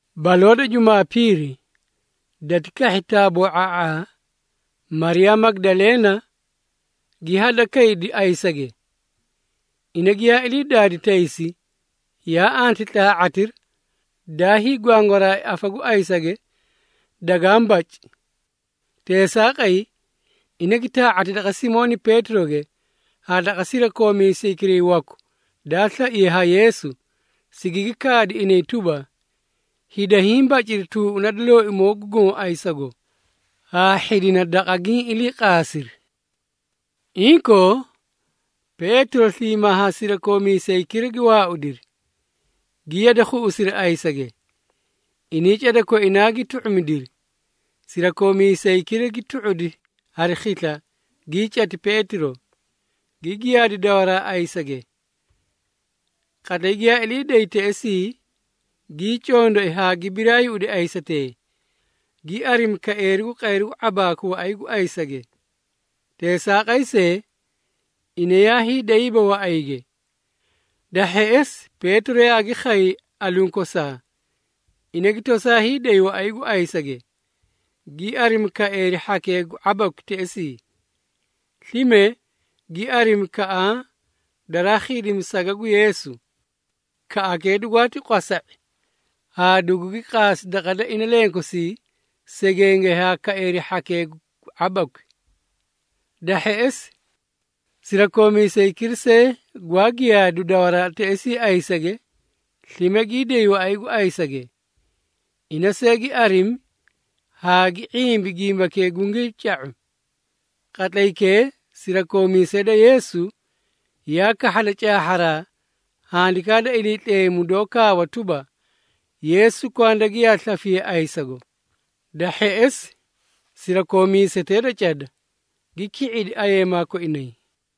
Baloo da Jumaapiiri, dati kahhi taaboo⁄a⁄aa, Mariyaa Magidaleena, gi hadakaydi ayisage. Ina giyaa ilii daadi taysi, yaa anti tlaa⁄atira, daa hiigwangwaraai afa gu ayisage dagaã baci. Teesaaqay, ina gi taa⁄ati daqa Simooni Peetiroge haa daqa sirakoomiisaykira waku daa slaiye ha Yeesu, sigigi kaadi inay tuba, “Hida hiĩ baciri tuuꞌuna da Looimoo gu Goõ ayisago, haa hhidina daqa giĩ iliiqaasiri!” Inkoo, Peetiro sliimaa haa sirakoomiisaykira gi waaudiri, gi yade khuiri ayisage. Inay cada koinaa gi tu⁄umidiri, sirakoomiisaykira gi tu⁄udi hari khisla, gii cati Peetiro, gi giyaadi dawaraa ayisage. Qatlay giyaa ilii day teꞌesii, gii condoi haa gi biraayuꞌudi ayisatee, gi arimi kaeeri gu qayru gu ⁄abaaku waꞌay gu ayisage. Teesaaqay see, ina yaa hiidayiiba waꞌayge. Da hheꞌesi, Peetiro yaagi khay aluũ kosaa, ina gi tosaa hiiday waꞌay gu ayisage, gi arimi kaeeri hhakee gu ⁄abakwi teꞌesii. Slime gi arimi kaꞌaã daraa khiidimi saga gu Yeesu. Kaꞌakee dugwaati qwasa⁄i haa dugugi qaasi daqa da inalenkosii segenge haa kaeeri hhakee gu ⁄abakwi. Da hheꞌesi, sirakoomiisaykira see gwaa giyaadu dawaraa teꞌesii ayisage, slime gii day waꞌay gu ayisage. Ina see, gi arimi haa gi ⁄imbi gimbakee gungii ca⁄u. Qatlaykee sirakoomiisee da Yeesu yaa kahhada caahharaa Handikaa da Iliitleemu, doó kaawa tuba, Yeesu kwanda giyaa slafiye ayisago. Da hheꞌesi, sirakoomiisetee da cada, gi ki⁄idi ayeemaa koinay.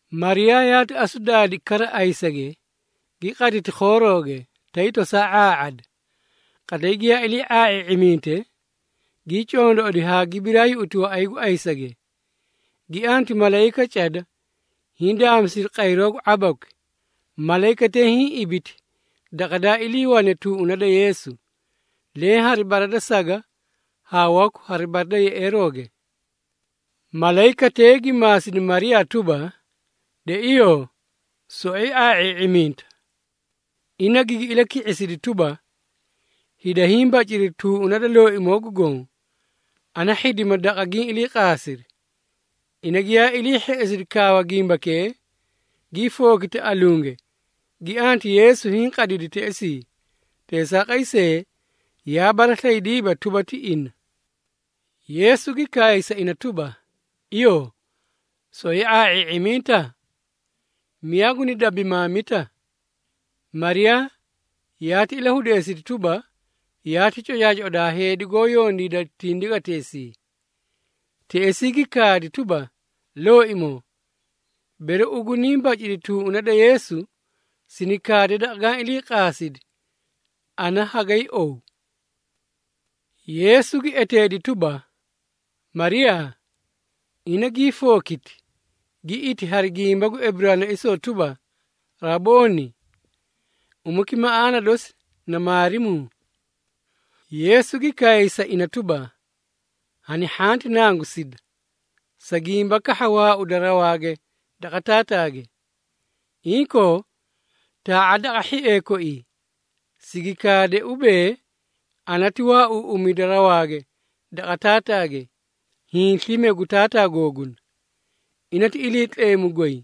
Mariyaa yaati asu daadi kara ayisage, gi qaditi khoorooge, tay tosaa ⁄aa⁄ada. Qatlay giyaa ilii ⁄aa⁄ii⁄iminte, gii condoꞌodi haa gi birayuꞌuti waꞌay gu ayisage, gi anti malayika cada, hindaamisiri qayroo gu ⁄abakwi. Malayikatee hiĩ ibiti daqa daa iliiwane tuuꞌuna da Yeesu, leẽ hari bara da saga haa waku bara da yeꞌeerooge. Malayikatee gi maasidi Mariyaa tuba, “De iyoo, soꞌoyi ⁄aa⁄ii⁄iminta?” Ina gigi ilaki⁄isidi tuba, “Hida hiĩ baciri tuuꞌuna da Looimoo gu Goõ, ana hhidima daqa giĩ iliiqaasiri!” Ina giyaa ilii hheꞌesidi kaawa gimbakee, gii fookiti alunge, gi anti Yeesu hiĩ qadidi teꞌesii. Teesaaqay see, yaa baraslaydiiba tuba, ti ina. Yeesu gi kaay sa ina tuba, “Iyoo, soꞌoyi ⁄aa⁄ii⁄iminta? Miyaa guni dabimaamita?” Mariyaa, yaati ilahudeesidi tuba, yaati cocaacoꞌoda haa heedi goó yondiida tindigateesii. Teꞌesii gi kaadi tuba, “Looimoo, bere ugu niĩ bacidi tuuꞌuna da Yeesu, sini kaade daqa gaã ilii qaasidi, ana hagay ow.” Yeesu gi eteedi tuba, “Mariyaa.” Ina gii fookiti, gi iti hari gimba gu Eburaanaisoo tuba, “Rabooni!” (Umaki maꞌaana dosi na “Maarimuu.”) Yeesu gi kaay sa ina tuba, “Hani hhanti nangusida, sa gimba kahha waauda rawaage daqa Taataage. Inkoo, taa⁄a daqa hhiee koii, sigi kaadee ubee ana ti waauuꞌumida rawaage daqa Taataage, hiĩ slime gu Taataa googuna. Ina ti Iliitleemu goy,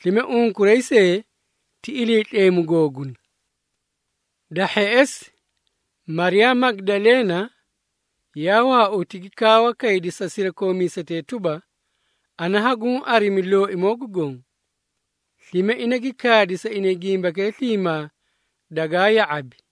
slime unkuray see ti Iliitleemu googuna.” Da hheꞌesi, Mariyaa Magidaleena, yaa waauti gi kaawa kaydi sa sirakoomiisetee tuba, “Ana haguũ arimi Looimoo gu Goõ!” Slime ina gi kaadi sa inay gimbakee sliimaa dagaa ya⁄abi.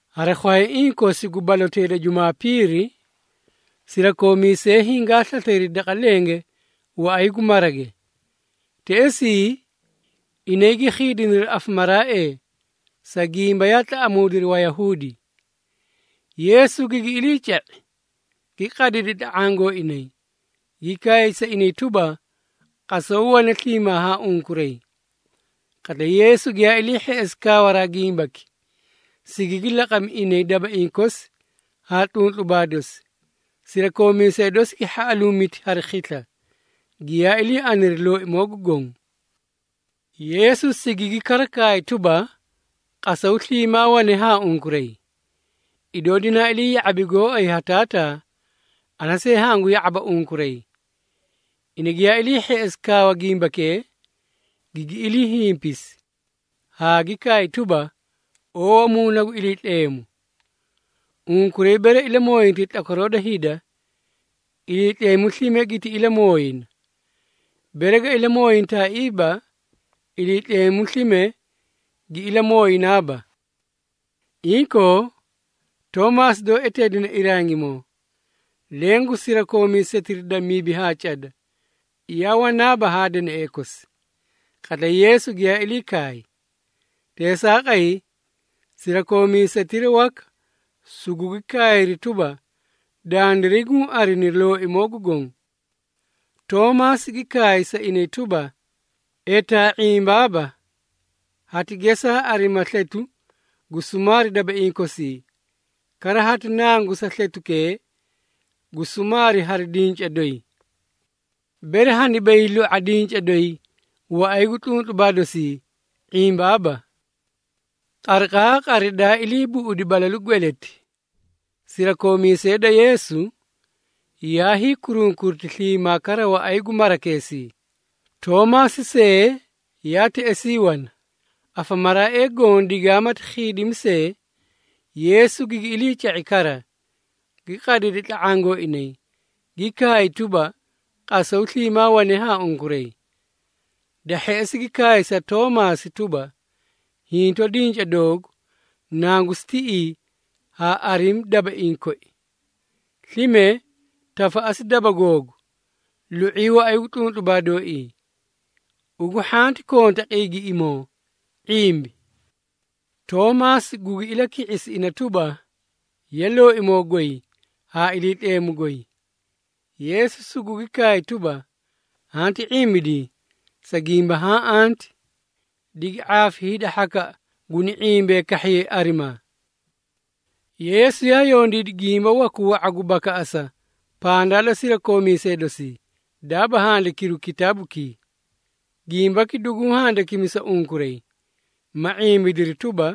Hari khwayaiĩ kosi gu balotee da Jumaapiiri, sirakoomiisee hingaa slaslaydi daqa lenge waꞌay gu marage. Teꞌesii, inay gi khiidiniri afamaraaee, sa gimba yaa tlaꞌamuudiri Wayahuudi. Yeesu gigi iliica⁄i, gi qadidi tla⁄aã gooinay, gi kaay sa inay tuba, “Qasaw wane sliimaa haa unkuray.” Qatlay Yeesu giyaa ilii hheꞌesi kaawaraa gimbaki, sigigi laqami inay dabaiĩ kosi haa tluntlubaa dosi. Sirakoomiisee dosi gi hhaꞌaluumiti hari khisla, giyaa ilii aniri Looimoo gu Goõ. Yeesu sigigi kara kaay tuba, “Qasaw sliimaa wane haa unkuray. Idoo dinaa ilii ya⁄abi gooay ha Taataa, ana see hangu ya⁄aba unkuray.” Ina giyaa ilii hheꞌesi kaawa gimbakee, gigi ilii hinpisi, haa gi kaay tuba, “Oowa Muuna gu Iliitleemu. Unkuray bere ilamooyintay tlakwaroo da hida, Iliitleemu slime giti ilamooyina, bere ga ilamooyintaaiiba, Iliitleemu slime gi ilamooyinaaba.” Inkoo, Toomaasi doó eteedine Irangimoo, leẽ gu sirakoomiisetira da mibi haa cada, yaa wanaaba haa danaee kosi, qatlay Yeesu giyaa ilii khay. Teesaaqay, sirakoomiisetira waka, sugugi kaayri tuba, “Dandiray guũ arini Looimoo gu Goõ.” Toomaasi gi kaay sa inay tuba, “Etaa ⁄imbaaba, hati gesaa arima sletu gu sumaari dabaiĩ kosii, kara hati nangusa sletukee gu sumaari hari dinca doyi! Bere haniba hiilu⁄a dinca doyi waꞌay gu tluntlubaa dosii, ⁄imbaaba.” Qariqaaqari daa ilii buꞌudi balalu gweleti, sirakoomiisee da Yeesu, yaa hiikurunkuriti sliimaa kara waꞌay gu marakeesii, Toomaasi see yaa teꞌesii wana. Afamaraaee goõ digaamati khiidimi see, Yeesu gigi iliica⁄i kara, gi qadidi tla⁄aã gooinay, gi kaay tuba, “Qasaw wane sliimaa haa unkuray.” Da hheꞌesi gi kaay sa Toomaasi tuba, “Hinto dinca doogu nangusi tiꞌii haa arimi dabaiĩ koi. Slime tafaꞌasi daba googu lu⁄ii waꞌay gu tluntlubaa dooii. Ugu hhanti konta qiigiꞌimoo, ⁄imbi.” Toomaasi gugi ilaki⁄isi ina tuba, “Ye! Looimoo goy haa Iliitleemu goy!” Yeesu sugugi kaay tuba, “Hanti ⁄imbidii, sa gimba haã anti. Digi ⁄aafi hida hhakaꞌa guniĩ ⁄imbee kahhiyay arimaa!” Yeesu yaa yondiidi gimba waku wa⁄a gu bakaꞌasa pandaa da sirakoomiisee dosii, daaba handikiru kitaabukii. Gimbaki duguũ handikimi sa unkuray, ma ⁄imbidiri tuba,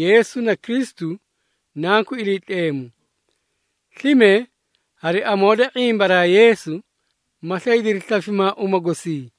Yeesu na Kristu, Nanku Iliitleemu. Slime, hari amoo da ⁄imbaraa Yeesu, ma slaydiri slafimaa uma gosii.